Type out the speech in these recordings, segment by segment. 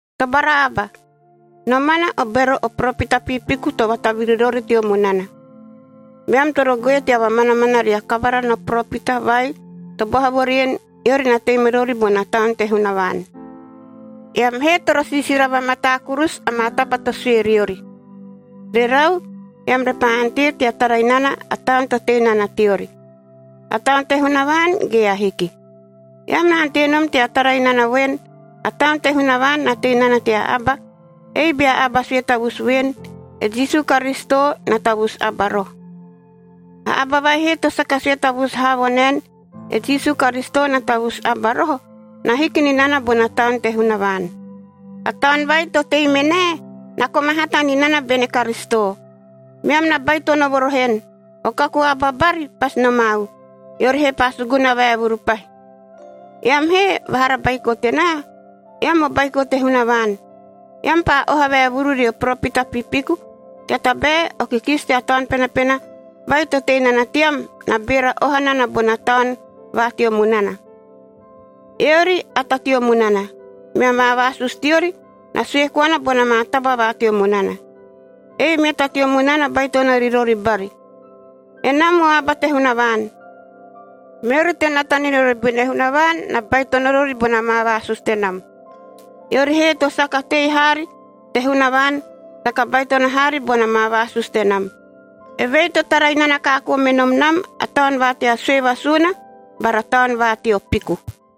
Tobara aba! Nomana o bero o poropita piipiku to vataviri rori teo munana. Meam toro goe tea vamanamana ria kavara no poropita vai to boha vo rien, eori na tei me rori bona Taun te Hunavaan. Eam he toro siisira vamataa kurusu amaa taba to sue riori, rerau, eam repaa ante tea tara inana a taun to tei nana teori. A Taun te Hunavaan ge ahiki. Eam na ante nom tea tara inana voen, a Taun te Hunavaan na tei nana tea aba, ei bea aba sue tavusu voen, e Jisu Karisito na tavusu aba roho. A aba vai he to saka sue tavusu haa vo naen, e Jisu Karisito na tavusu aba roho, na hiki ni nana bona Taun te Hunavaan. A taun vai to tei me nae, na koma hata ni nana bene Karisito.a Meam na baitono vo roho en, o kaku aba bari pasi nomau, eori he paa suguna vaevuru pahi. Eam he, vahara baiko tenaa, eam o baiko te Hunavaan. Eam paa oha vaevuru rio poropita piipiku, tea tabae o kikisi tea Taun Penapena vai to tei nana team, na beera oha nana bona taun va teo munana. Eori a ta teo munana, mea maa vaasusu teori na sue koana bona maa taba va teo munana. Ei mea ta teo munana baitono ri rori bari. Enam o aba te Hunavaan. Meori to nata ni rori bene Hunavaan, na baitono rori bona maa vaasusu tenam. Eori he to saka tei haari te Hunavaan, saka baitono haari bona maa vaasusu tenam. Evei to tara inana kaakoo me nom nam a taun va tea sue vasuuna bara taun va teo piku.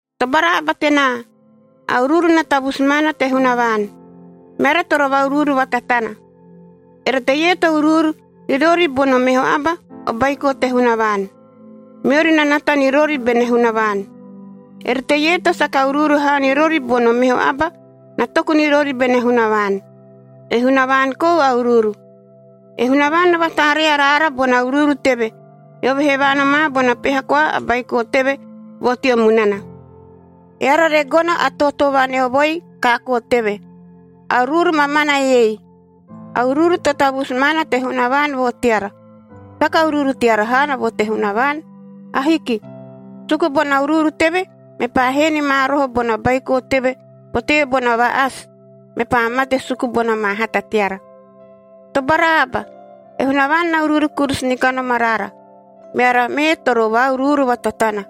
Tobara aba tenaa! A uruuru na tavusu maana te Hunavaan, meara toro va-uruuru vatatana. Ere teie to uruuru ri rori bono meho aba, o baiko te Hunavaan, meori na nata ni rori bene Hunavaan. Ere teie to saka uruuru haa ri rori bono meho aba, na toku ni rori bene Hunavaan. E Hunavaan kou a uruuru. E Hunavaan na vataaree araara bona uruuru teve, eove he vaanomaa bona peha koa a Baiko teve vo teo munana, eara re gono a tootoo vaneovoi kaakoo teve. A uruuru mamana eiei: A uruuru to tavusu maana te Hunavaan vo teara. Saka uruuru teara haana vo te Hunavaan. Ahiki. Suku bona uruuru teve, mepaa hee ni ma roho bona Baiko teve potee bona va-asi, mepaa mate suku bona maa hata teara. Tobara aba! E Hunavaan na uruuru kurusu ni kanom araara, meara mee toro va-uruuru vatatana.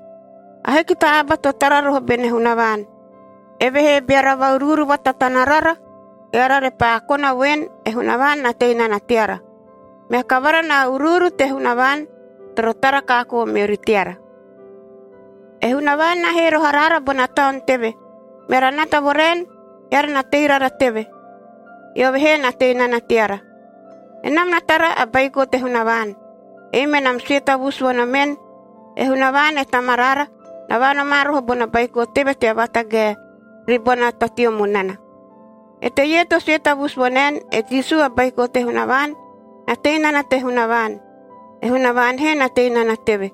Ahiki ta aba to tara roho bene Hunavaan. Evehee beara va-uruuru vatatana rara, eara repaa kona voen, e Hunavaan na tei nana teara. Mea kavara na uruuru te Hunavaan toro tara kaakoo meori teara. E Hunavaan na hee roho araara bona Taun teve, meara nata vo raen: Eara na tei rara teve, eove he na tei nana teara. Enam na tara a Baiko te Hunavaan. Ei menam sue tavusu vo nomen, e Hunavaan e Tamaraara na vaanomaa roho bona Baiko teve tea vatagae ribona ta teo munana. Eteie to sue tavusu vo naen, e Jisu a Baiko te Hunavaan, na tei nana te Hunavaan, e Hunavaan he na tei nana teve.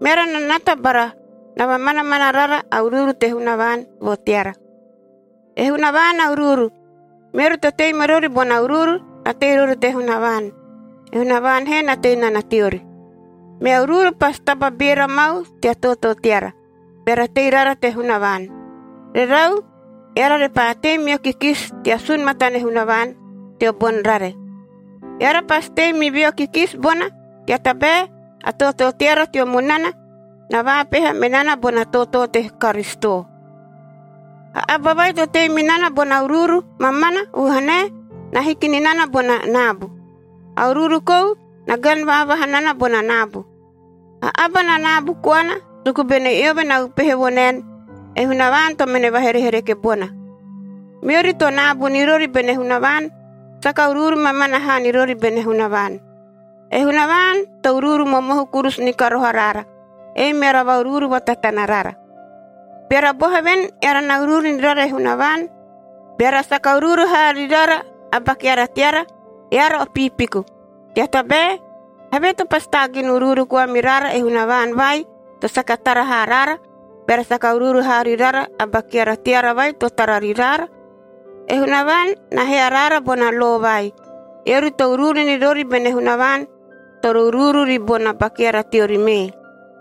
Meara na nata bara na vamanamana rara a uruuru te Hunavaan vo teara. E Hunavaan a uruuru, meori to tei me rori bona uruuru, na tei rori te Hunavaan, e Hunavaan he na tei nana teori. Mea uruuru pasi taba beera mau tea tootoo teara, beara tei rara te Hunavaan. Rerau, eara repaa tei meo kikisi tea sun matane Hunavaan teo boni rare. Eara pasi tei mi veo kikisi bona, tea tabae a tootoo teara teo munana na vaapeha me nana bona tootoo te Karisito. A aba vai to tei mi nana bona uruuru mamana vuhanae na hiki ni nana bona naabu. A uruuru kou na gani vaavaha nana bona naabu. A aba na naabu koana suku bene eove na upehe vo naen, e Hunavaan to mene vaherehereke bona. Meori to naabu ni rori bene Hunavaan, saka uruuru mamana haa ni rori bene Hunavaan. E Hunavaan to uruuru momohu kurusu ni ka roho araara, ei meara va-uruuru vatatana rara. Beara boha voen eara na uruuru ni rara e Hunavaan, beara saka uruuru haa ri rara a ba keara teara, eara o piipiku. Tea tabae, havee to pasi taagin uruuru koa mi rara e Hunavaan vai to saka tara haa raara, beara saka uruuru haa ri rara a ba keara teara vai to tara ri raara? E Hunavaan na hee araara bona lo vai: “Eori to uruuru ni rori bene Hunavaan toro uruuru ribona ba keara teori mee.”